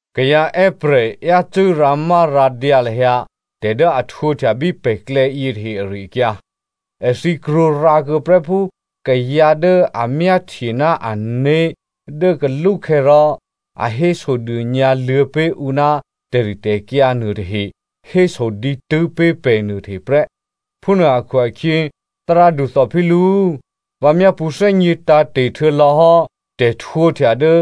Kayǎ è́prè̤ yácû́ rǎmárǎdyǎ lahyǎ tè̤ dố a htwǒhtya bí pè̤klè̌ yětahe ari-akyǎ. Èthǐ krwǒrǎkuô̌ prè́ phú kayǎ dố a myáhtye ná ané̤ dố kalúkhè̌ rò a hésodônyǎ luô̌ pé̤ ǔ ná tè̤ritè̤kyǎ nuôtahe héso dǐtû́ pé̤ pè̤ nuôtahe prè́. Phúnuô akhu-akhyě, Thárádu Theophilo꤮, vǎ myápṳ̌ thè́gně tǎ̤te̤ htuô̌lò̌ hò́ tè̤htwǒhtya dố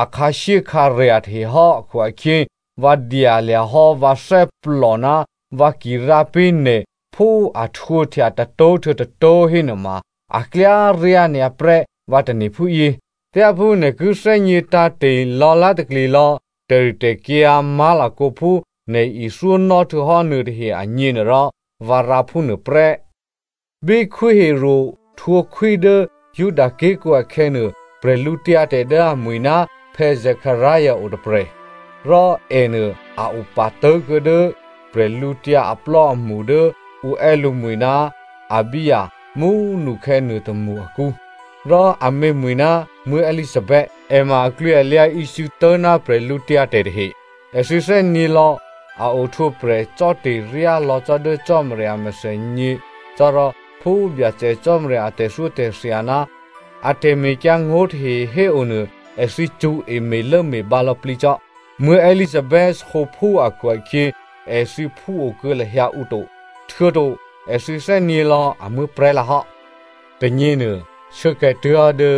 a khǎshyékhǎrya̤ tahehò́ akhu-akhyě, vǎ dyalya̤ hò́ vǎ thè́plò ná vǎ ki rǎ pé̤ nè̤ phú a htwǒhtya tôtó̤ htuô̌ tôtó̤ hénuôma a klyá ryá nyǎ prè́ vǎ tane̤ phúyě. Thyáphú nè̤ ki thè́gně tǎ̤te̤ lò̌lá̤takli lò̌ tè̤ritè̤kyǎ má̤lakǒ phú nè̤ ithyónò́ htuô̌hò́ nuôtahe agněnuôrò, vǎ rǎ phúnuô prè́. Bí Khwí Herodè htwǒ khwí dố Juda ké̤kǔ akhè̌nuô, bwídu dố amwi̤ ná Zekaria otôprè̤. Rò ènuô a opatố̤kuô̌ dố prè̤lǔtyǎ aplò́amṳ dố ǔ è́ lǔmwi̤ ná Abijah mú꤮ nukhè̌ nuôtômṳ akǔ, rò amě mwi̤ ná Elizabeth. È ma aklwǐalyǎ ícû̌tố̤ ná bwídu tahe. Èthǐ thè́nyě̤ lò̌ a ohtwǒprè̤ cò́te̤ryá lò̌ cò́ dố Cò́marya a mèthènyě cò́ rò phú Byacè Cò́marya a tè̤thyótè̤thya ná a tè̤mekyǎngó̤ tahe héonuô èthǐ cṳ̌e me̤lốme̤bǎ lò̌plǐ cò́. Elizabeth sǒphú akhu-akhyě èthǐ phúo kuô̌ lahyǎ ǔ to, htuô̌to èthǐ thè́nyě̤lò̌ a muố̤prè̤́ lǎhò́. Tônyěnuô, shuốkhè̌ tuố̤hò́ dố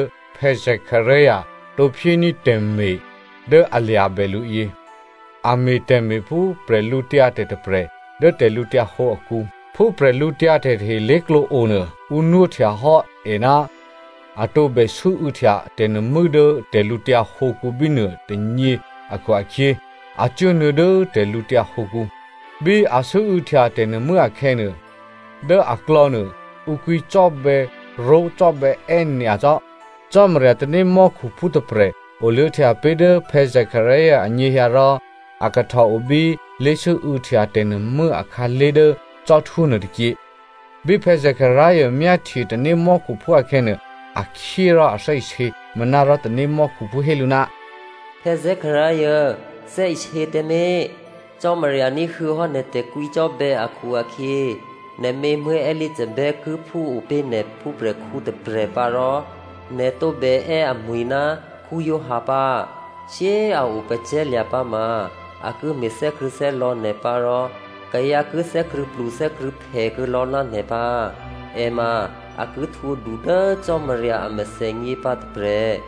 Zekaria tǒ phyéní̤ tè̤me̤ dố a lya̤bè lǔ yě. A me̤ tè̤me̤ phú bwídu tôprè̤ dố tè̤lǔhǒdu akǔ. Phú bwídu tahe lé̤klǒ onuô, ǔ nwóhtya hò́ è ná a tǒbè sû́û̌htya tè̤nuô̤mû́ dố tè̤lǔtyǎ hǒkǔ bínuô tônyě akhu-akhyě, a cuốnuô̌ dố tè̤lǔtyǎ hǒkǔ. Bí a sû́û̌htya tè̤nuô̤mû́ akhè̌nuô, dố aklò̌nuô, ǔ kwǐcò́bè̌ró̤cò́bè̌è́ nyacò́. Cò́marya tanémò́khuphú tôprè̤ oluô̌htya pé̤ dố Zekaria anyěhyǎ rò a kahtò o bí lé̤sû́û̌htya tè̤nuô̤mû́ akhǎlé̤ dố cò́htwó nuôtôkyě. Bí Zekaria myáhtye tanémò́khuphú akhè̌nuô, a khyé rò a thè́isě. Manárò tanémò́khuphú hé lǔ, “Zekaria꤮ thè́isě tǎmé̤! Cò́marya ní̤huô̌ hò́ nè̤ tè̤kwǐcò́bè̌ akhu-akhyě nè̤mě Elizabeth ki phúo pé̤ nè̤ phúprè̤khǔ tôprè̤ pǎ rò nè̤ tǒbè è́ amwǐ̤ ná Giovanni pǎ. Shyé꤮ a o pacè̤̌lya̤ pǎ ma a ki me̤ thè́krṳ̂̌thè́lò̌ nè̤ pǎ rò kayǎ ki thè́krṳ̂̌plu thè́krṳ̂̌phè kuô̌lò̌ ná nè̤ pǎ. È ma a ki htwǒ du dố Cò́marya a mèthènyě pǎ tôprè̤.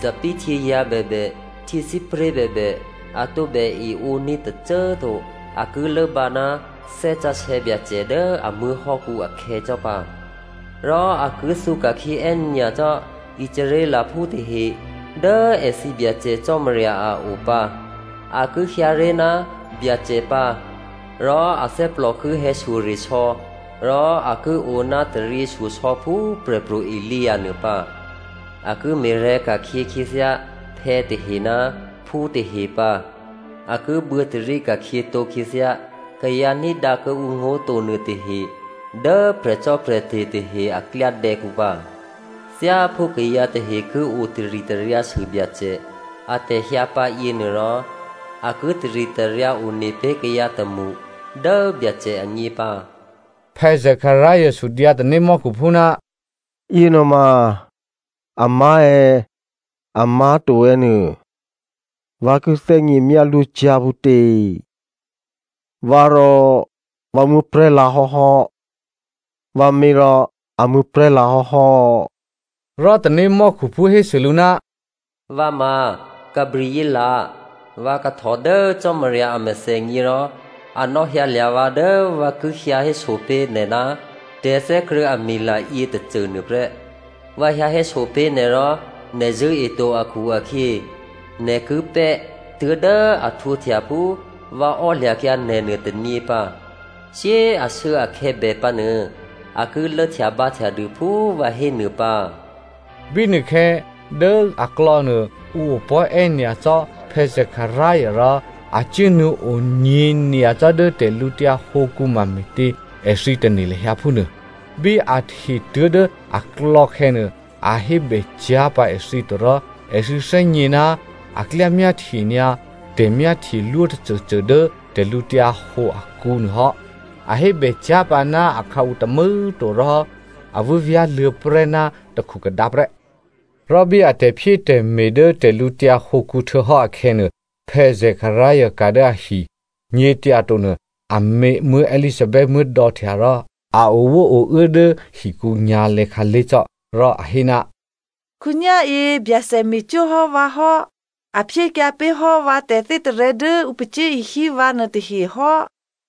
Thòbǐthèhtyězǎ̤ bèbè, htyěsípré̤ bèbè a tǒbè eǒní̤ tôcô꤮ to. A ki lốbǎ ná Thè́ Sǎsè̌ Byacè dố a muố̤hò́kǔ akhè̌ cò́ pǎ. Rò a ki thǔ ka̤khyě è́nyacò́ Israelphú tahe dố èthǐ Byacè Cò́marya a o pǎ. A ki hyǎ ré̤ ná Byacè pǎ, rò athè́plò ki hè̌shyoresò̌ rò a ki o ná taryěshyosò̌ phú Prè̤pro̤ Elia nuô pǎ. A ki me̤rè̤̌ ka̤khyě khyěthyá phè̌tahe ná phútahe pǎ. A ki buô̌tarí ka̤khyětǒ khyěthyá kayǎ ní̤dǎ kuô̌ǔ ngó̤ to nuôtahe dố prè̤cò́prè̤te̤ tahe a klyádè̌kǔ pǎ. Thyáphú kayǎ tahe ki otaritaryǎsû Byacè atè̤hyǎ pǎ yěnuôrò, a ki taritaryǎ one pé̤ kayǎ tômṳ dố Byacè agně pǎ.” Zekaria sudyǎ tanémò́khuphú, “Yěnuôma amá̤ è̌, amá̤to è̌ nuô, vǎ ki thè́gně myálwó cyá̤ phútě? Vǎ rò vǎ muố̤prè̤́ lǎ hò́hò́, vǎmě rò a muố̤prè̤́ lǎhò́hò́.” Rò tanémò́khuphú hésû lǔ, “Vǎ ma Gabrielè, vǎ kahtò dố Cò́marya a mèthènyě rò a nò̌hyǎlya̤ vǎ dố vǎ ki hyǎ héso pé̤ nè̤ ná tè̤thè́krṳ̂̌mila yětôcô nuôprè́. Vǎ hyǎ héso pé̤ nè̤ rò nè̤ zṳ̂́eto akhu-akhyě, nè̤ ki pè́ tuố̤dố a htwǒhtya phú vǎ ò́lya̤kyǎ nè̤ nuôtônyě pǎ. Shyé꤮ ashuốakhè̌ bè pǎnuô, a ki lốhtyabǎhtya dû phú vǎ hénuô pǎ.” Bínuôkhè̌ dố aklò̌nuô ǔ opò̤́ è́nyacò́ Zekaria rò a cuốnuô̌ onyě̤ nyacò́ dố tè̤lǔtyǎ hǒkǔ mame̤tě èthǐ tane̤ lahyǎ phúnuô. Bí a hte tuố̤dố aklò̌ khè̌nuô a hébè cyá̤ pǎ èthǐ to rò èthǐ thè́gně ná a klyá myáhtye nyǎ tè̤myáhtyelwó tôcôcô dố tè̤lǔhǒdu akǔ nuô hò́. A hébè cyá̤ pǎ ná akhǎu tômû̌꤮ to rò a vû́vyá̤luô̌ prè́ ná takhukhadǎ prè́. Rò bí a tè̤phyétè̤me̤ dố tè̤lǔtyǎ hǒkǔ htuô̌hò́ akhè̌nuô, Zekaria ka̤ dố ahi. Nyě̤tyatonuô amě Elizabeth muố̤dò̌htya rò a owóouố dố hikǔ nyǎ̤lè̌ khǎlé̤ cò́. Rò a hé, “Khǒnyá̤yě Byacè me̤cwó̤ hò́ vǎ hò́. A phyékyǎ pé̤ hò́ vǎ tè̤thè́tarè̤̌ dố ǔ pacyé̤ishyé vǎ nuôtahe hò́.”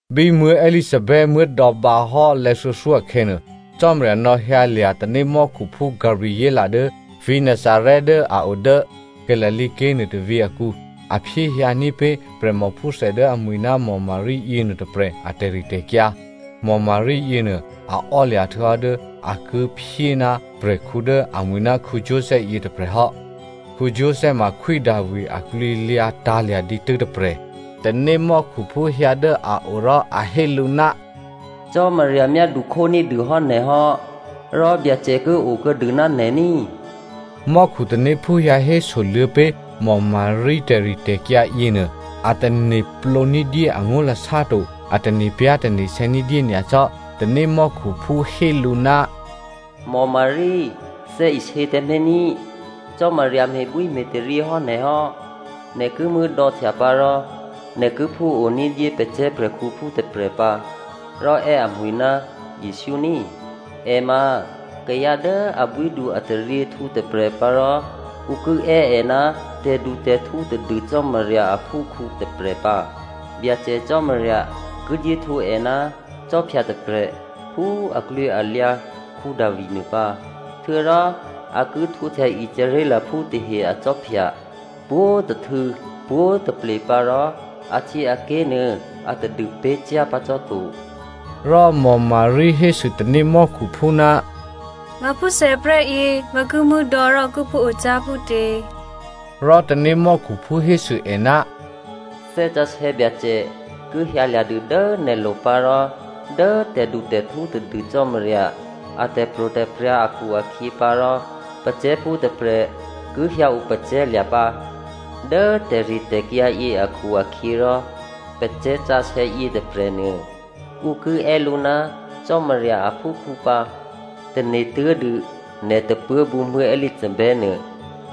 Bí Elizabeth muố̤dò̌ bǎhò́ lè̌thuô̌thyó akhè̌nuô, Cò́marya nò̌hyǎlya̤ tanémò́khuphú Gabrielè dố vǐ̤ Nazarè dố a o dố Galilea ké̤ nuôtôvǐ̤ akǔ. A phyéhyǎ ní̤pé̤ prè̤mòphúthè dố amwi̤ ná Maria yěnuô tôprè̤ a tè̤ritè̤kyǎ. Maria yěnuô a ò́lya̤ htuô̌hò́ dố a ki phyé ná prè̤khǔ dố amwi̤ ná Joseph yěnuô tôprè̤ hò́. Joseph ma Khwí Davi aklwǐlyǎ tǎ̤lya̤ dǐtû́ tôprè̤. Tanémò́khuphú hyǎ dố a o rò a hé lǔ, “Cò́marya myádu khóní̤dûhò́ nè̤ hò́, rò Byacè ki okuô̌dû ná nè̤ ní꤮.” Mò́khutanéphú hyǎ hésoluô̌ pé̤ Maria tè̤ritè̤kyǎ yěnuô, a tane̤plǒ ní̤dyé angó̤lasá to, a tane̤pyá̤tane̤sè̌ ní̤dyé nyacò́. Tanémò́khuphú hé lǔ, “Maria꤮ thè́isě tǎmé̤ ní! Cò́marya me̤bwíme̤taryě hò́ nè̤ hò́. Nè̤ ki muố̤dò̌htya pǎ rò nè̤ ki phúo ní̤dyé pacè̤̌ prè̤khǔphú tôprè̤ pǎ, rò è́ amwǐ̤ ná Jesǔ ní꤮. È ma kayǎ dố abwídu-ataryěhtǔ tôprè̤ pǎ rò ǔ ki è́ è ná tè̤dutè̤htǔ tadû Cò́marya aphúkhǔ tôprè̤ pǎ. Byacè Cò́marya ki dyé htwǒ è ná khwí tôprè̤ phú aklwǐalyǎ Davi nuô pǎ. Htuô̌rò a ki htwǒhtya Israelphú tahe akhwí pwǒ̤tôhtû̌ pwǒ̤taple pǎ rò ahtyěaké̤ nuô atadû pé̤ cyá̤ pǎ cò́ to.” Rò Maria hésû tanémò́khuphú, “Vǎ phúthè prè́yě, vǎ ki muố̤dò̌ rò ki phúo cyá̤ phútě?” Rò tanémò́khuphú hésû è, “Thè́ Sǎsè̌ Byacè ki hyǎlya̤ dû dố nè̤lo̤ pǎ rò dố tè̤dutè̤htǔ tadû Cò́marya a tè̤pro̤tè̤prya̤ akhu-akhyě pǎ rò pacè̤̌phú tôprè̤ ki hyǎo pacè̤̌lya̤ pǎ. Dố tè̤ritè̤kyǎ yě akhu-akhyěrò pacè̤̌sǎsè̌ yětôprè̤nuô ǔ ki è́ lǔ ná Cò́marya aphúkhǔ pǎ. Tane̤tuố̤dû nè̤ tôpuố̤bǔ Elizabeth nuô,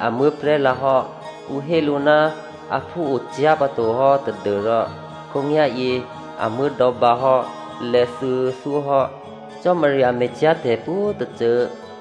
a muố̤prè̤́ lǎhò́. Ǔ hé lǔ ná aphú o cyá̤ pǎto hò́ tadû́rò, khǒnyá̤yě a muố̤dò̌ bǎhò́ lè̌thuô̌thyó hò́. Cò́marya me̤cyá̤ tè̤pwǒ̤tôcô.”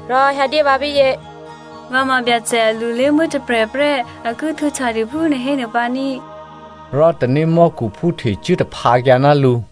Rò Maria hésû, “Vǎ ma Byacè a lulémuố̤ tôprè̤ prè́. A ki htwǒhtyadû phú nè̤ hénuô pǎ ní꤮.” Rò tanémò́khuphú htecuố taphǎkyǎ ná lǔ.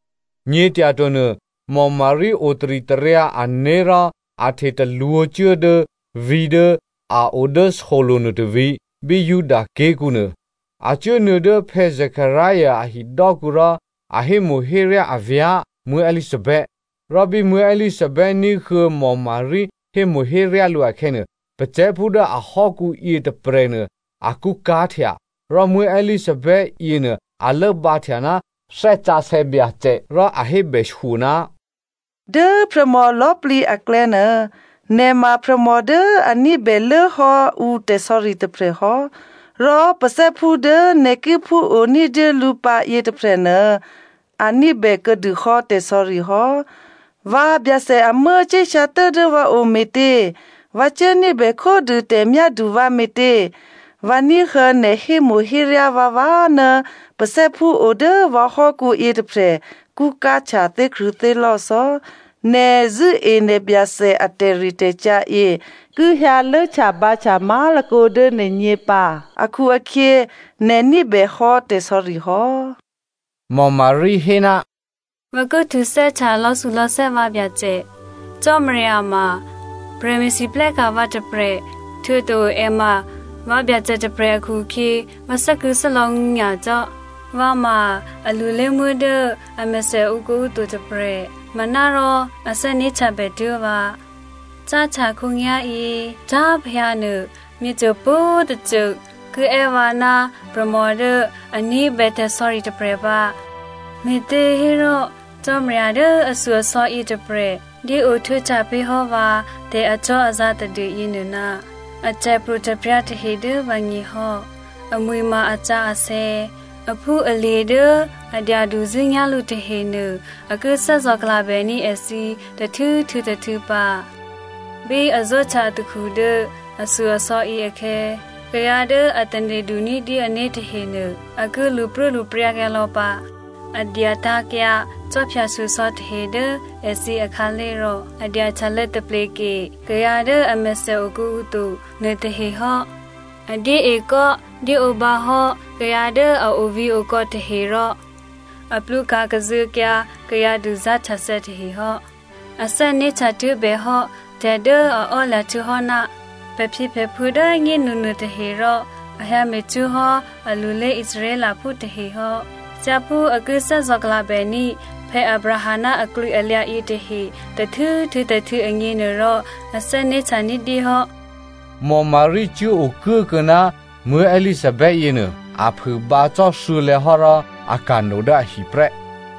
Nyě̤tyato nuô, Maria otaritaryǎ ané̤ rò a htetalwǒ̤ cuố dố vǐ̤ dố a o dố solo̤ nuôtôvǐ̤, bí Judaké̤kǔ nuô. A cuốnuô̌ dố Zekaria a hidò́kǔ rò a hémo̤héryá avyá̤ Elizabeth. Rò bí Elizabeth ní̤huô̌ Maria hémo̤héryá lǔ akhè̌nuô, pacè̤̌phú dố ahò́kǔ yětôprè̤nuô, a kṳ́ká̤htya. Rò Elizabeth yěnuô a lốbǎhtya ná Thè́ Sǎsè̌ Byacè. Rò a hébèshyo, “Dố prè̤mò lò̌꤮ plǐ aklè̌nuô nè̤ ma prè̤mò dố a ní̤bè lốhò́ ǔ tè̤sò̌ri tôprè̤ hò́ rò pacè̤̌phú dố nè̤ ki phúo ní̤dyé lǔ pǎ yětôprè̤nuô a ní̤bè kuô̌dûhò́ tè̤sò̌ri hò́. Vǎ Byacè amuố̤ cuốhyǎtuố̤ dố vǎ o me̤tě? Vǎ cuố ní̤bè khódû tè̤myádu vǎ me̤tě? Vǎ ní̤huô̌ nè̤ hémo̤héryá vǎvǎ ná pacè̤̌phú o dố vǎhò́kǔ yětôprè̤ kṳ́ká̤htya thè́krṳ̂̌thè́lò̌ cò́. Nè̤ zṳ̂́e ná Byacè a tè̤ritè̤kyǎ yě ki hyǎ lốhtyabǎhtya má̤lakǒ dố nè̤gně pǎ akhu-akhyě nè̤ ní̤bèhò́ tè̤sò̌ri hò́!” Maria hé, “Vǎ ki htuthè́htya lò̌thulò̌thè́ vǎ Byacè. Cò́marya ma prè̤me̤lwóhteka̤ vǎ tôprè̤ htuô̌to è ma vǎ Byacè tôprè̤ akhu-akhyě vǎ thè́krṳ̂̌thè́lò̌ nyacò́. Vǎ ma a lulémuố̤ dố amèthè okuô̌ǔ to tôprè̤ manárò a thè́né̤htyabè tuố̤ vǎ. Cáhtya khǒnyá̤yě tǎ̤plehyǎnuô myěcô pwǒ̤꤮ tôcô ki è́ vǎ ná prè̤mò dố a ní̤bè tè̤sò̌ri tôprè̤ pǎ. Me̤těhérò Cò́marya dố ashyo-asò̌ yětôprè̤ dyéo htwǒhtya pé̤hò́ vǎ tè̤acò́azǎ̤ tadû yěnuô ná a tè̤pro̤tè̤prya̤ tahe dố vǎgně hò́. Amwi̤ ma asǎsè̌. Aphúalye̤ dố a dyaduzṳ̂́nyá̤ lǔ tahenuô, a ki thè́zò̤klabèní̤ èthǐ tôhtû̌ htuô̌ tôhtû̌ pǎ. Bí a zó̤htya atakhu dố ashyo-asò̌ yě akhè̌, kayǎ dố a tane̤du ní̤dyé ané̤ tahenuô, a ki lṳpruốlṳpryǎkyǎ lò̌ pǎ. A dyatǎ̤kyǎ khwí shyosò̌ tahe dố èthǐ akhǎlé̤ rò a dyahtyalô̌ tapleke kayǎ dố amèthè okuô̌ǔ to nuôtahe hò́. A dyéekò́ dyéǒbǎ hò́ kayǎ dố a ovǐ̤okò̌ tahe rò a plwǒka̤ kazuô̌kyǎ kayǎ duzá̤htyathè̌ tahe hò́. A thè́né̤htya tuố̤bèhò́ tè̤ dố a ò́lya̤ htuô̌hò́ ná pè̤phyěpè̤phuô̌ dố꤮ nyénu nuôtahe rò a hyǎme̤cwó̤ hò́ alulé Israelphú tahe hò́. Thyáphú a ki thè́zò̤klabèní̤ Abraham ná aklwǐalyǎ yětahe tôhtû̌ htuô̌ tôhtû̌ agněnuôrò, a thè́né̤htya ní̤dyé hò́.” Maria cuốokuốkuô̌ ná Elizabeth yěnuô a phûbǎ cò́ thuô̌lè̌ hò́ rò a ka̤no dố ahi prè́.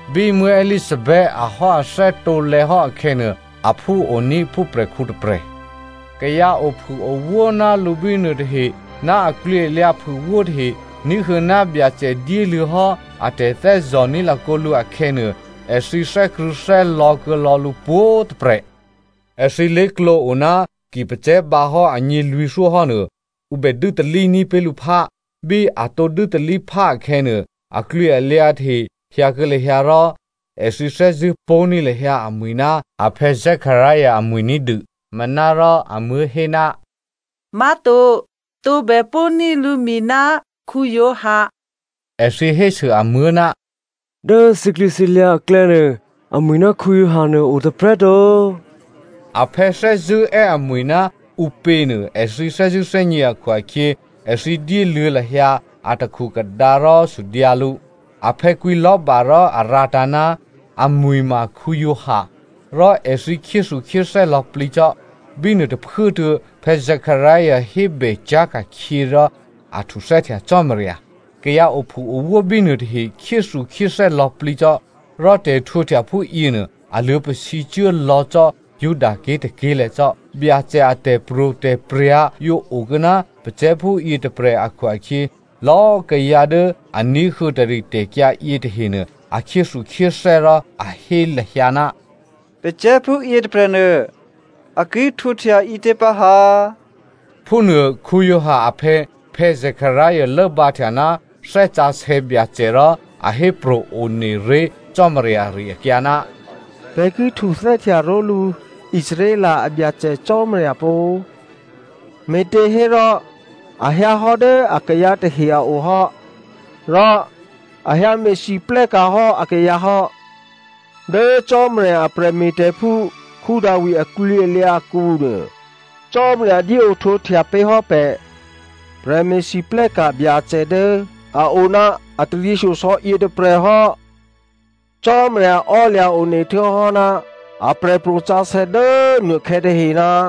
Bí Elizabeth ahò́athè́ tǒlè̌ hò́ akhè̌nuô, aphú oní̤ phúprè̤khǔ tôprè̤. Kayǎ ophûowó ná lǔ bínuô tahe ná aklwǐalyǎ phûwó tahe ní̤huô̌ ná Byacè dyéluô̌ hò́ a tè̤thè́zò̤ní̤ lakǒ lǔ akhè̌nuô, èthǐ thè́krṳ̂̌thè́lò̌ kuô̌lò̌ lǔ pwǒ̤꤮ tôprè̤. Èthǐ lé̤klǒ o ná ki pacè̤̌ bǎhò́ agně lwǐ̤thyó hénuô, ǔ bè dû́talí ní̤pé̤ lǔphá. Bí atǒ dû́talíphá akhè̌nuô, aklwǐalyǎ tahe hyǎkuô̌ lahyǎ rò èthǐ thè́zṳ̂́ pó̤ní̤ lahyǎ amwǐ̤ ná aphè̌ Zekaria amwi̤ ní̤dû. Manárò amuố̤ hé, “Má̤to! Tǒbè pó̤ní̤ lǔmwǐ̤ ná Giovanni.” Èthǐ hésû amuố̤, “Dố thǐklwǐthǐlyǎ aklè̌nuô, amwi̤ ná Giovanni nuô a o tôprè̤꤮ to.” Aphè̌ thè́zṳ̂́ è́ amwǐ̤ ná ǔpěnuô èthǐ thè́zṳ̂́ thè́gně akhu-akhyě, èthǐ dyéluô̌ lahyǎ a takhukhadǎ rò sudyǎ lǔ. Aphè̌ kwǐ lò̤́ba rò a rǎtǎ̤, “Amwi̤ ma Giovanni.” Rò èthǐ khyéthukhyéthè́ lò̌plǐ cò́. Bínuô tôphuốtuô̌ Zekaria hébè cyá̤ ka̤khyě rò a htuthè́htya Cò́marya. Kayǎ ophûowó bínuô tahe khyéthukhyéthè́ lò̌plǐ cò́, rò tè̤htwǒhtya phúyěnuô a luô̌pasǐ cuốlò̌ cò́ Judaké̤ tôké̤lè̤̌ cò́. Byacè a tè̤pro̤tè̤prya̤ yǒ okuô̌ ná pacè̤̌phú yětôprè̤ akhu-akhyě, lò̌꤮ kayǎ dố a ní̤huô̌ tè̤ritè̤kyǎ yětahenuô a khyéthukhyéthè́ rò a hé lahyǎ, “Pacè̤̌phú yětôprè̤nuô a ki htwǒhtya ǐtě pǎ ha?” phúnuô. Giovanni aphè̌ Zekaria lốbǎhtya ná Thè́ Sǎsè̌ Byacè rò a hépro̤ one ré̤ Cò́marya ari-akyǎ, “Pè̤ ki htuthè́htya ró̤lǔ Israel a Byacè Cò́marya pó꤮. Me̤těhérò a hyǎhò́ dố akayǎ tahe a o hò́ rò a hyǎ me̤lwóhteka̤ hò́ akayǎ hò́. Dố Cò́marya a prè̤me̤tè̤phú Davi aklwǐalyǎ akǔnuô, Cò́marya dyéohtwǒhtya pé̤ hò́ pè̤ prè̤me̤lwóhteka̤ Byacè dố a o ná a taryěshyosò̌ yětôprè̤ hò́. Cò́marya ò́lya̤ one htuô̌hò́ ná aprè̤pro̤ sǎsè̌ dố nuôkhè̌ tahe,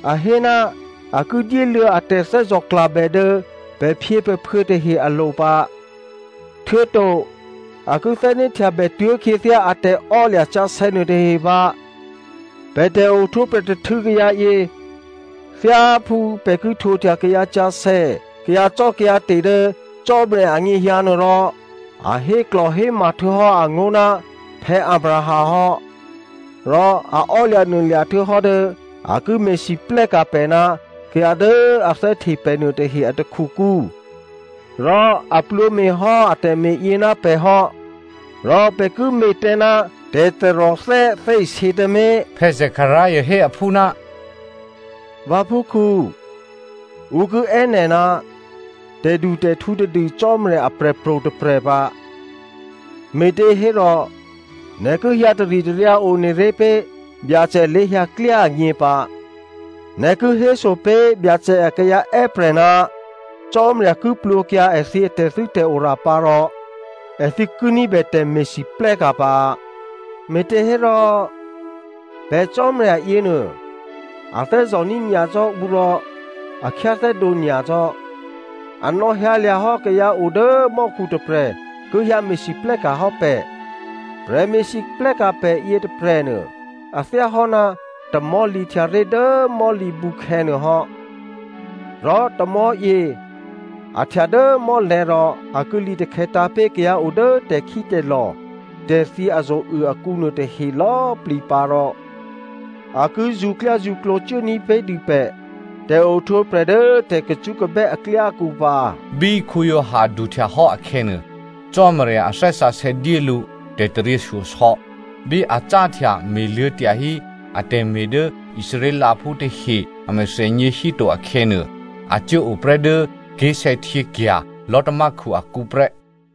A hé ná a ki dyéluô̌ a tè̤thè́zò̤klabè dố pè̤phyěpè̤phuô̌ tahe alo̤ pǎ, htuô̌to a ki thè́né̤htya bètuố̤ khyěthyá a tè̤ò́lya̤ sǎsè̌ nuôtahe pǎ. Pè̤ tè̤ohtwǒprè̤ tôhtû̌ kayǎyě, thyáphú pè̤ ki htwǒhtya kayǎsǎsè̌, kayǎcò́kayǎte̤ dố Cò́marya anyěhyǎ nuô rò, a héklò̤héma htuô̌hò́ angó̤ ná Abraham hò́, rò a ò́lya̤nuôlya̤ htuô̌hò́ dố a ki me̤lwóhteka̤ pè̤ ná kayǎ dố a thè́hte pè̤ nuôtahe a takhukǔ rò a plwǒme̤ hò́ a tè̤me̤yě ná pè̤ hò́, rò pè̤ ki me̤ tǎ ná tè̤taròthè́ thè́isě tǎmé̤.” Zekaria hé aphú, “Vǎphúkhǔ, ǔ ki è́ nè̤ ná tè̤dutè̤htǔ tadû Cò́marya aprè̤pro̤ tôprè̤ pǎ, me̤těhérò nè̤ ki hyǎ taritaryǎ one ré̤ pé̤ Byacè lé̤hyǎklyá agně pǎ. Nè̤ ki héso pé̤ Byacè akayǎ è́prè̤ ná Cò́marya ki plwǒkyǎ èthǐ tè̤thû́tè̤ora pǎ, rò èthǐ ki ní̤bè tè̤me̤lwóhteka̤ pǎ. Me̤těhérò pè̤ Cò́marya yěnuô, a thè́zò̤ní̤ nyacò́ ǔ rò a khyáthè́dǒ nyacò́. A nò̌hyǎlya̤hò́ kayǎ o dố mò́khu tôprè̤ ki hyǎ me̤lwóhteka̤ hò́ pè̤, prè̤me̤lwóhteka̤ pè̤ yětôprè̤nuô, a thyáhò́ ná tamò̤́ lǐhtyaré̤ dố mò̤́lǐbǔkhè̌ nuôhò́. Rò tamò̤́yě a htya dố mò́lè̤̌ rò a ki lǐtakhè̌tǎ̤ pé̤ kayǎ o dố tè̤khítè̤lò̤, tè̤thyě azo̤uô akǔ nuôtahe lò̌꤮ plǐ pǎ, rò a ki zṳ̌klyázṳ̌klǒ cuố ní̤pé̤dû pè̤ tè̤ohtwǒprè̤ dố tè̤kacṳ́kabè́ aklyákǔ pǎ.” Bí Giovanni duhtyahò́ akhè̌nuô, Cò́marya a Thè́ Sǎsè̌ dyé lǔ tè̤taryěshyosò̌. Bí a cáhtya me̤luô̌ tyahí atè̤me̤ dố Israelphú tahe a mèthènyě híto akhè̌nuô, a cuốo prè́ dố ké̤sè̌htyěkya̤ lò̤́tamákhu akǔ prè́.